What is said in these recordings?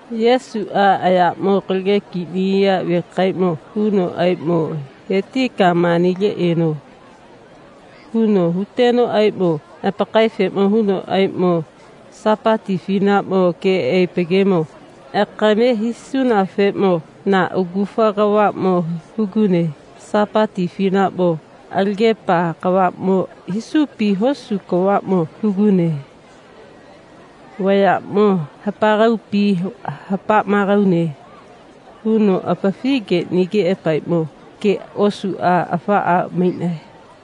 Yesuʼa ayaʼmo kalage kiʼniya vekaeʼmo hunoʼaeʼmo, he tika manile eno, huno hutenoʼaeʼmo apakaefeʼmo hunoʼaeʼmo, Sapati afinaʼmo keʼaepa gemo akame hisunafeʼmo na agufa kavaʼmo hugune. Sapati afinaʼmo alagepa kavaʼmo hisupi hosu kavaʼmo hugune. Vayaʼmo hapaegaupi hapa maegaune, huno apafi geʼnigeʼapaeʼmo ge osuʼa afaʼa maiʼnae.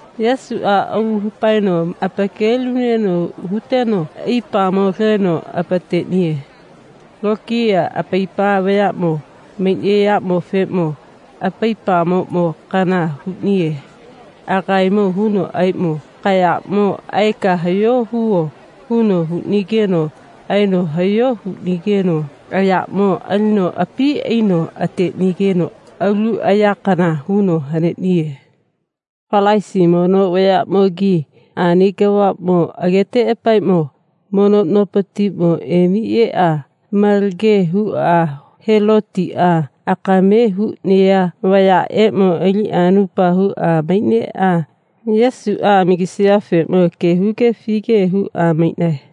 Yesuʼa aulu hapaeno apakelinuneno huteno aipamo leno apateʼniye. Lokiya apaipa vayaʼmo maiʼnayaʼmofeʼmo aipamoʼmo kana huʼniye. Agaemo hunoʼaeʼmo, kayaʼmo aeka hayo huvo, huno huʼnigeno aeno hayo huʼnigeno ayaʼmo alino api aino ateʼnigeno alu ayakana huno haneʼniye. Falasi mono vayaʼmogi ani kavaʼmo ageteʼapaeʼmo mono nopatiʼmo emi eʼa malage huʼa Helotiʼa akame huʼnaya vayaʼeʼmo aliʼa anupa huʼa maiʼneʼa Yesuʼa amagisayafeʼmo ge huge afige huʼa maiʼnae.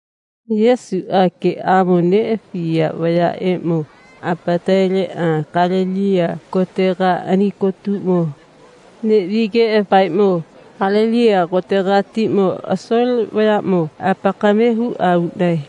Yesuʼe geʼamo neʼafiya vayaʼeʼmo apataleʼa Galeliya kotega ani kotutegamo neʼvageʼapaeʼmo Galeliya kotegatiʼmo asole vayaʼmo apakame huʼa uʼnae.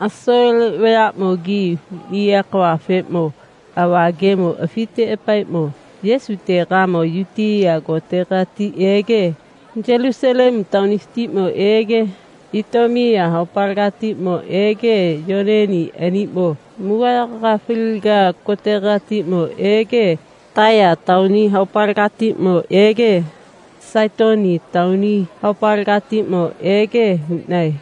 Asole vayaʼmogimo huʼniya kavafeʼmo ava gemo afiteʼapaeʼmo Yesutegamo Yutiya kotegati ege Yulusalemu taonifatiʼmo ege Itomiya haopaletiʼmo ege Yoneni aniʼmo mugagayaga faliga kotegatiʼmo ege Taiya taoni haopalegatiʼmo ege Saitoni taoni haopalegatiʼmo ege huʼnae.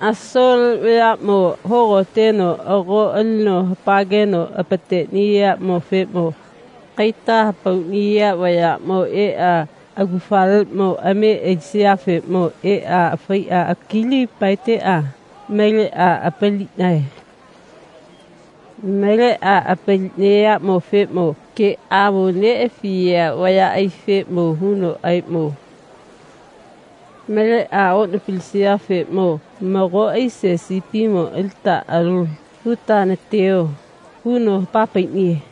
Asole vayaʼmo hogoteno ago alino hapageno apateʼniyaʼmofeʼmo kaita hapauʼniya vayaʼmo eʼa agufaleʼmo ame alisayafeʼmo eʼa faiʼa kili paeteʼa maleʼa apaliʼnae. Maleʼa apaliʼnayaʼmofeʼmo geʼamo neʼafiya vayaʼaifeʼmo hunoʼaeʼmo, maleʼa oʼnapalisayafeʼmo mago aise sipimo alita alo huta nateyo, huno hapa paiʼniye.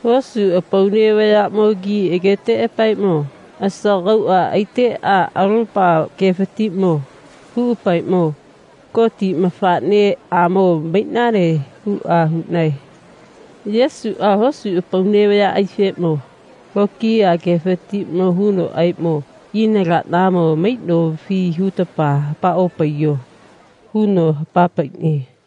Hosu apaune vayaʼmogi ageteʼapaeʼmo asagauʼa aiteʼa alopa gefatiʼmo huʼapaeʼmo, Goti mafaʼneʼamo maiʼnane, huʼa huʼnae. Yesuʼa hosu apaune vayaʼaifeʼmo lokiya gefatiʼmo hunoʼaeʼmo, ina laʼnamo maiʼnofi hutapa hapa opaiyo, huno hapa paiʼniye.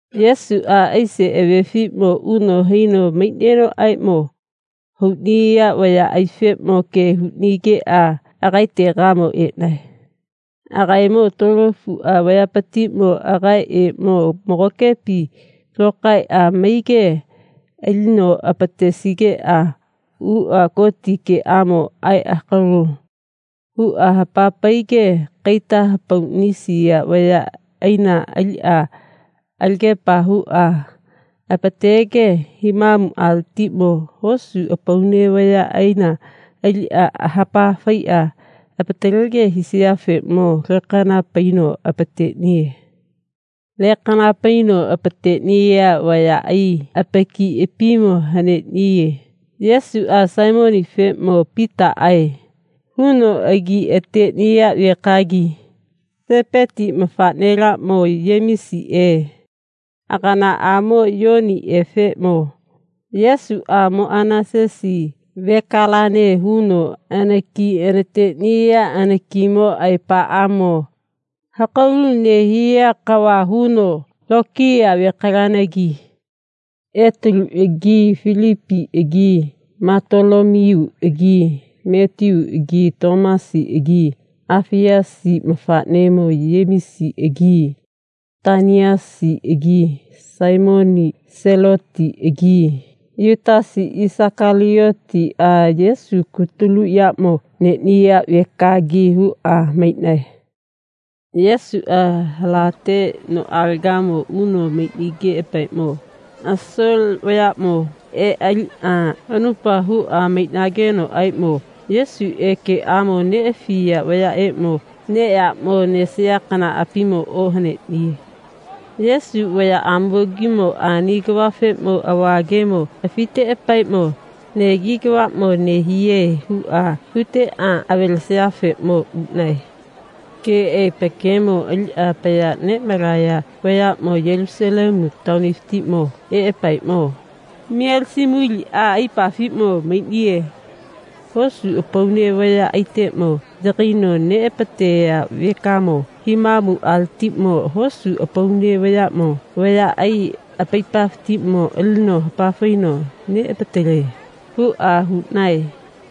Yesuʼa aise avefiʼmo uno haino maiʼnenoʼaeʼmo hauʼniya vayaʼaifeʼmo ge huʼnigeʼa agaetegamo eʼnae. Agaemo tuolofuʼa vayapatiʼmo agaeʼeʼmo magokepi lokaeʼa maige alino apatesigeʼa uʼa Goti geʼamo aeʼa hakalo huʼa hapa paige kaita hapauʼnisiya vayaʼaina aliʼa hapageʼa apatege himamuʼaletiʼmo hosu apaune vayaʼaina aliʼa hapa faiʼa apatalege hisayafeʼmo lekana paino apateʼniye. Lekana paino apateʼniya vayaʼai apakiʼapimo haneʼniye. Yesuʼa Saimonifeʼmo Pitaʼae huno agi ateʼniya vekagi Sepeti mafaʼnelaʼmo Yemisiʼe aganaʼamo Yoniʼefeʼmo Yesuʼa Moʼanasesi vekalane huno anaki anateʼniya anakimo aepaʼamo hakalu nehiya kava huno lokiya vekalanagi Etaluʼagi Filipiʼagi Matolomiyuʼagi Matiyuʼagi Tomasiʼagi Afiyasi mafaʼnemo Yemisiʼagi Taʼniyasiʼagi Saimoni Selotiʼagi Yutasi Isakaliyotiʼa Yesu kutulu yaʼmo neʼniya vekagi huʼa maiʼnae. Yesuʼa halate noʼalega uno maiʼnigeʼapaeʼmo asole vayaʼmo eʼa aliʼa anupa huʼa maiʼnagenoʼaeʼmo Yesuʼe geʼamo neʼafiya vayaʼeʼmo neʼyaʼmo nesaya kanaʼapimo ohaneʼniye. Yesu vayaʼamogimo ani kavafeʼmo ava gemo afiteʼapaeʼmo, negi kavaʼmo nehiye, huʼa huteʼa avalesayafeʼmo uʼnae. Keʼaepa gemo aliʼa apaya neʼmalaya vayaʼmo Yulusalemu taonifatiʼmo eʼapaeʼmo, Mielisemuliʼa aipafiʼmo maiʼniye. Hosu apaune vayaʼaiteʼmo yagaino neʼapateya vekamo himamuʼaletiʼmo hosu apaune vayaʼmo vayaʼai apaipafatiʼmo alino hapafaino neʼapatale, huʼa huʼnae.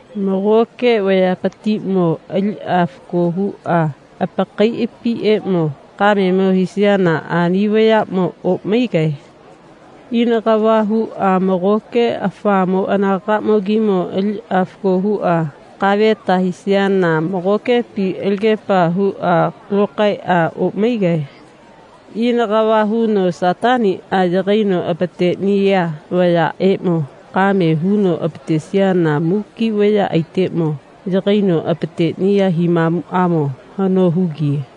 Magoke vayapatiʼmo aliʼa fako huʼa apakaiʼapiʼeʼmo kamemo hisayana ani vayaʼmo oʼmaigae. Ina kava huʼa magoke afamo anagaʼmogimo aliʼa fako huʼa kaveta hisayana magokepi alagepa huʼa lokaeʼa oʼmaigae. Ina kava huno Sataniʼa yagaino apateʼniya vayaʼaʼeʼmo kame huno apatesiyana muki vayaʼaiteʼmo yagaino apateʼniya himamuʼamo hano hugiye.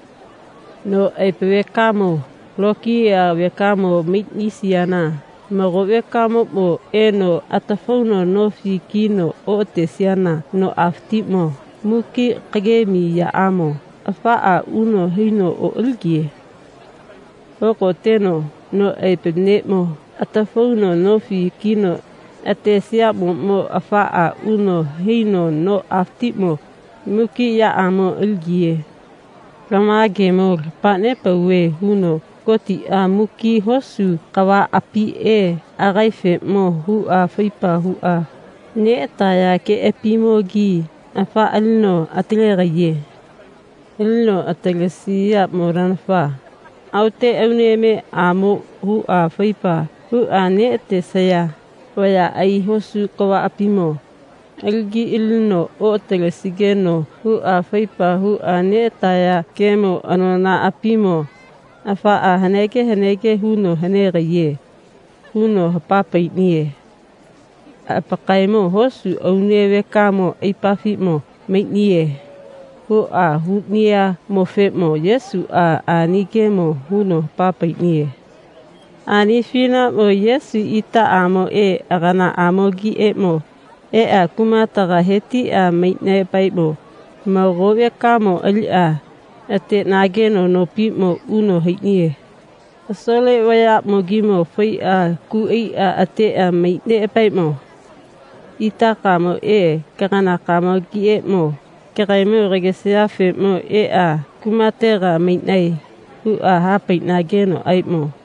No aepa vekamo lokiya vekamo maiʼnisiyana mago vekamoʼmo eno atafauno nofi kino oʼatesiyana noʼafatiʼmo muki kagemi yaʼamo afaʼa uno haino oʼaligiye. Hogoteno no aepa neʼmo atafauno nofi kino atesiyaʼmoʼmo afaʼa uno haino noʼafatiʼmo muki yaʼamo aligiye. Lama gemo lapa nepauve, huno, Gotiʼa muki hosu kavaʼapiʼe agaefeʼmo huʼa faipa huʼa neʼataya geʼapiʼeʼmo afaʼa alino atalegaiye. Alino atalegaiyaʼmonanafa aote Aunemeʼaeʼmo huʼa faipa huʼa neʼatesaya vayaʼai hosu kavaʼapimo alagi alino oʼatalesigeno huʼa faipa huʼa neʼataya gemo anonaʼapimo afaʼa hanege hanege huno hanegaiye, huno hapa paiʼniye. Apakaemo hosu aune vekamo aipafiʼmo maiʼniye, huʼa huʼnayaʼmofeʼmo Yesuʼa ani gemo huno hapa paiʼniye. Ani afinaʼmo Yesu itaʼamoʼe aganaʼamogiʼeʼmo eʼa kumategamo he tiʼa maiʼneʼapaeʼmo mago vekamo aliʼa ateʼnageno nopiʼmo uno haiʼniye. Asole vayaʼmogimo faiʼa ku aiʼa ateʼa maiʼneʼapaeʼmo, itakamoʼe kaganakamogiʼeʼmo kagaemo kagesayafeʼmo eʼa kumatega maiʼnae, huʼa ha paiʼnagenoʼaeʼmo,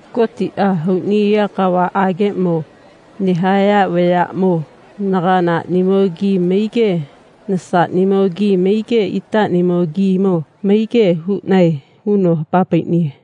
Gotiʼa hauʼniya kavaʼageʼmo nehaya vayaʼmo naganaʼnimogi maige nasaʼnimogi maige itaʼnimogimo maige huʼnae, huno hapa paiʼniye.